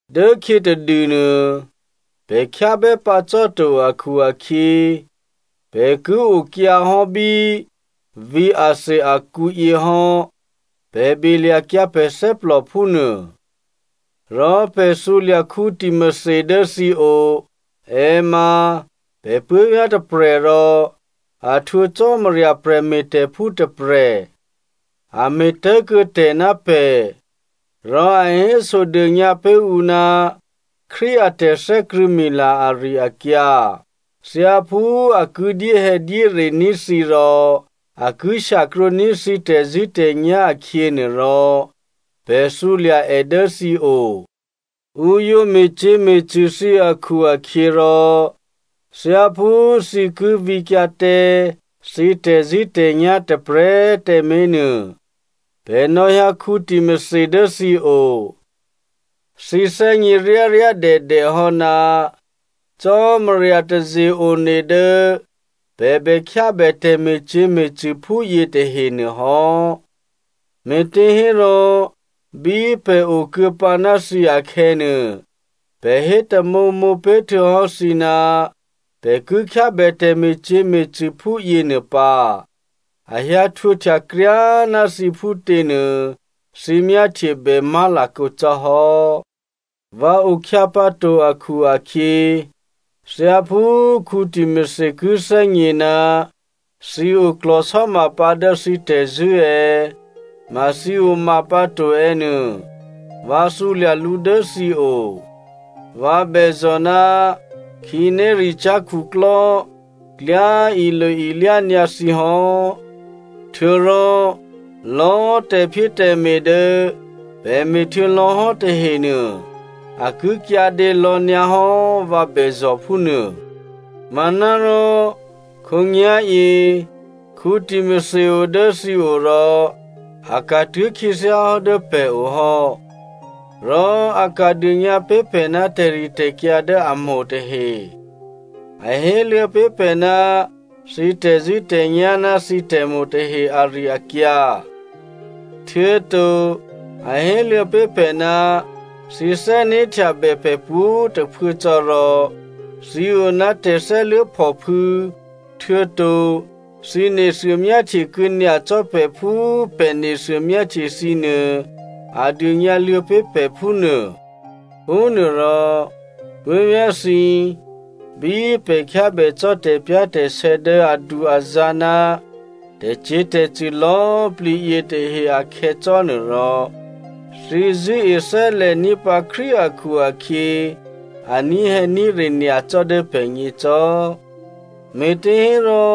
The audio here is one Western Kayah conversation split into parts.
Dốkhyě tadûnuô pè̤ khyábè́ pǎ cò́to akhu-akhyě, pè̤ ki okyǎhò́ bí vǐ̤ Athenia akǔ yě hò́ pè̤ belya̤kyǎ pè̤ thè́plò phúnuô. Rò pè̤ thǔlya̤ Timothy dố thǐo, è ma pè̤ puố̤vyá̤ tôprè̤ rò a htwǒ Cò́marya prè̤me̤tè̤phú tôprè̤. A me̤tố̤kuô̌tè̤ ná pè̤, rò a hésodônyǎ pé̤ ǔ ná Krístu a tè̤thè́krṳ̂̌mila ari-akyǎ. Thyáphú a ki dyéhè̌dyérení̤ thǐ rò a ki shyakrwǒní̤ thǐ tè̤zṳ̂́tè̤nyá̤ akhyě nuôrò, pè̤ thǔlya̤ è dố thǐo. Ǔ yǒ me̤cyě̤me̤cṳ̂ thǐ akhu-akhyěrò thyáphú thǐ ki vǐkyǎ tǎ thǐ tè̤zṳ̂́tè̤nyá̤ tôprè̤꤮ tǎmé̤nuô, pè̤ nò̌hyǎ Timothy dố thǐo. Thǐ thè́gně ryáryádèdè hò́ ná Cò́marya taze-one dố pè̤ bè khyábè tè̤me̤cyě̤me̤cṳ̂ phúyě tahe nuôhò́. Me̤těhérò bí pè̤ okuô̌pǎ ná thǐ akhè̌nuô, pè̤ hé tamǒmǒ pé̤ htuô̌hò́ thǐ ná pè̤ ki khyábè tè̤me̤cyě̤me̤cṳ̂ phúyě nuô pǎ. A hyǎ htwǒhtya kryá꤮ ná thǐ phútěnuô thǐ myáhtyebè má̤lakǒ cò́hò́. Vǎ okhyǎ pǎto akhu-akhyě, thyáphú Timothy ki thè́gně ná thǐ oklò̤sò́mapǎ dố thǐ tè̤zṳ̂́ è̌, ma thǐ oma pǎ to è̌ nuô, vǎ thǔlya̤ lǔ dố thǐ o. Vǎ bèzò̤ ná khǐnéricyá̤ khuklò́ klyá ilo-ilyá nyǎ thǐ hò́. Htuô̌rò lò̌꤮ tè̤phyétè̤me̤ dố pè̤ me̤htuô̌ lò̌hò́ tahenuô, a ki kyǎdě lò̌nyǎhò́, vǎ bèzò̤ phúnuô. Manárò khǒnyá̤yě Timothy o dố thǐo rò a ka̤tuố̤ khyěthyáhò́ dố pè̤o hò́. Rò a ka̤ dônyǎ pé̤ pè̤ ná tè̤ritè̤kyǎ dố a mo̤ tahe. A héluô̌ pé̤ pè̤ ná thǐ tè̤zṳ̂́tè̤nyá̤ ná thǐ tè̤mo̤ tahe ari-akyǎ. Htuô̌to a héluô̌ pé̤ pè̤ ná thǐ thè́né̤htyabè pè̤ pwǒ̤꤮ tôphuố cò́, rò thǐ o ná tè̤thè́luố̤phòphû̌, htuô̌to thǐ nethuô myáhtyekuô̌ nyacò́ pè̤ phú pè̤ nethuô myáhtye thǐnuô, a dônyǎluô̌ pé̤ pè̤ phúnuô. Phúnuôrò puố̤vyá̤thǐ, bí pè̤ khyábè cò́ tè̤pyá̤tè̤sè̌ dố adu-azǎ̤ ná tè̤cyě̤tè̤cṳ̂ lò̌꤮ plǐ yětahe akhè̌ cò́nuôrò, thǐ zṳ̂́e thè́lè̤ní̤ pǎ Krístu akhu-akhyě, a ní̤hè̌ní̤re nyacò́ dố pè̤gně cò́. Me̤těhérò,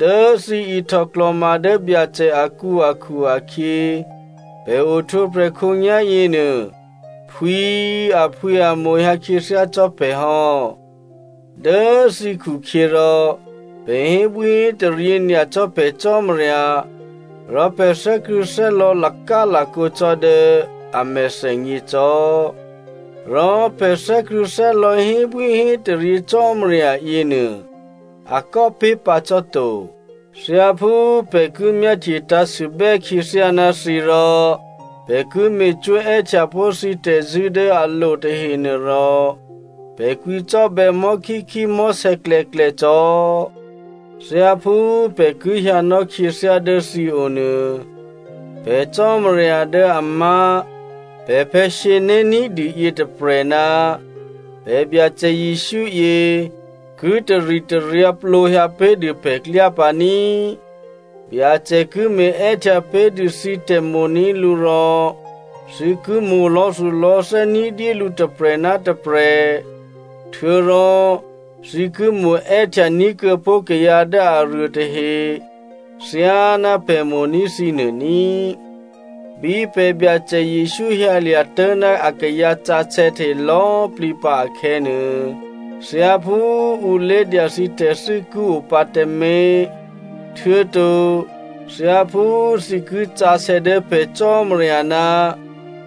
dố thǐ ihtò klò̤ma dố Byacè akǔ akhu-akhyě, pè̤ ohtwǒprè̤ khǒnyá̤ yěnuô, phwǐ꤮ aphwǐamo̤hyǎ khyěthyá cò́ pè̤ hò́. Dố thǐ khukhyěrò, pè̤ hébwíhétaryě nyacò́ pè̤ Cò́marya rò pè̤ thè́krṳ̂̌thè́lò̌ lakálakǒ cò́ dố a mèthènyě cò́. Rò pè̤ thè́krṳ̂̌thè́lò̌ hébwíhétaryě Cò́marya yěnuô, a kò́ pé̤ pǎ cò́ to. Thyáphú pè̤ ki myáhtye tǎ̤sûbè́ khyěthyá ná thǐ rò pè̤ ki me̤cwó̤ è́htyapó̤ thǐ tè̤zṳ̂́ dố a lo tahenuôrò, pè̤ kwǐcò́bè̌ mò̤́khíkhí mò̤́sè̌klè̌klè̌ cò́. Thyáphú pè̤ ki hyǎnò́ khyěthyá dố thǐo nuô, pè̤ Cò́marya dố a má̤ pè̤phè̌ sǐné̤ ní̤dû yětôprè̤ ná pè̤ Byacè Jesǔ yě ki taritaryǎ plǒhyǎ pé̤dû pè̤klyá pǎ ní꤮. Byacè ki me̤è́htya pé̤dû thǐ tè̤mo̤ní̤ lǔ rò, thǐ ki mo̤ lò̌thulò̌thè́ ní̤dyélǔ tôprè̤ ná tôprè̤, htuô̌rò thǐ ki mo̤è́htya ní̤kuô̌pó̤ kayǎ dố aruô tahe thyáná pè̤ mo̤ní̤ thǐnuô ní꤮. Bí pè̤ Byacè Jesǔ hyǎlya̤ tố̤ ná akayǎ sǎsè̌ tahe lò̌plǐ pǎ akhè̌nuô, thyáphú ǔ lé̤dya thǐ tè̤thû́ ki o pǎ tǎmé̤, htuô̌to thyáphú thǐ ki sǎsè̌ dố pè̤ Cò́marya ná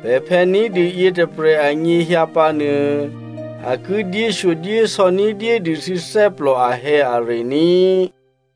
pè̤phè̌ ní̤dû yětôprè̤ anyěhyǎ pǎnuô, a ki dyéshyodyésò̌ ní̤dyédû thǐ thè́plò ahè̌are ní꤮.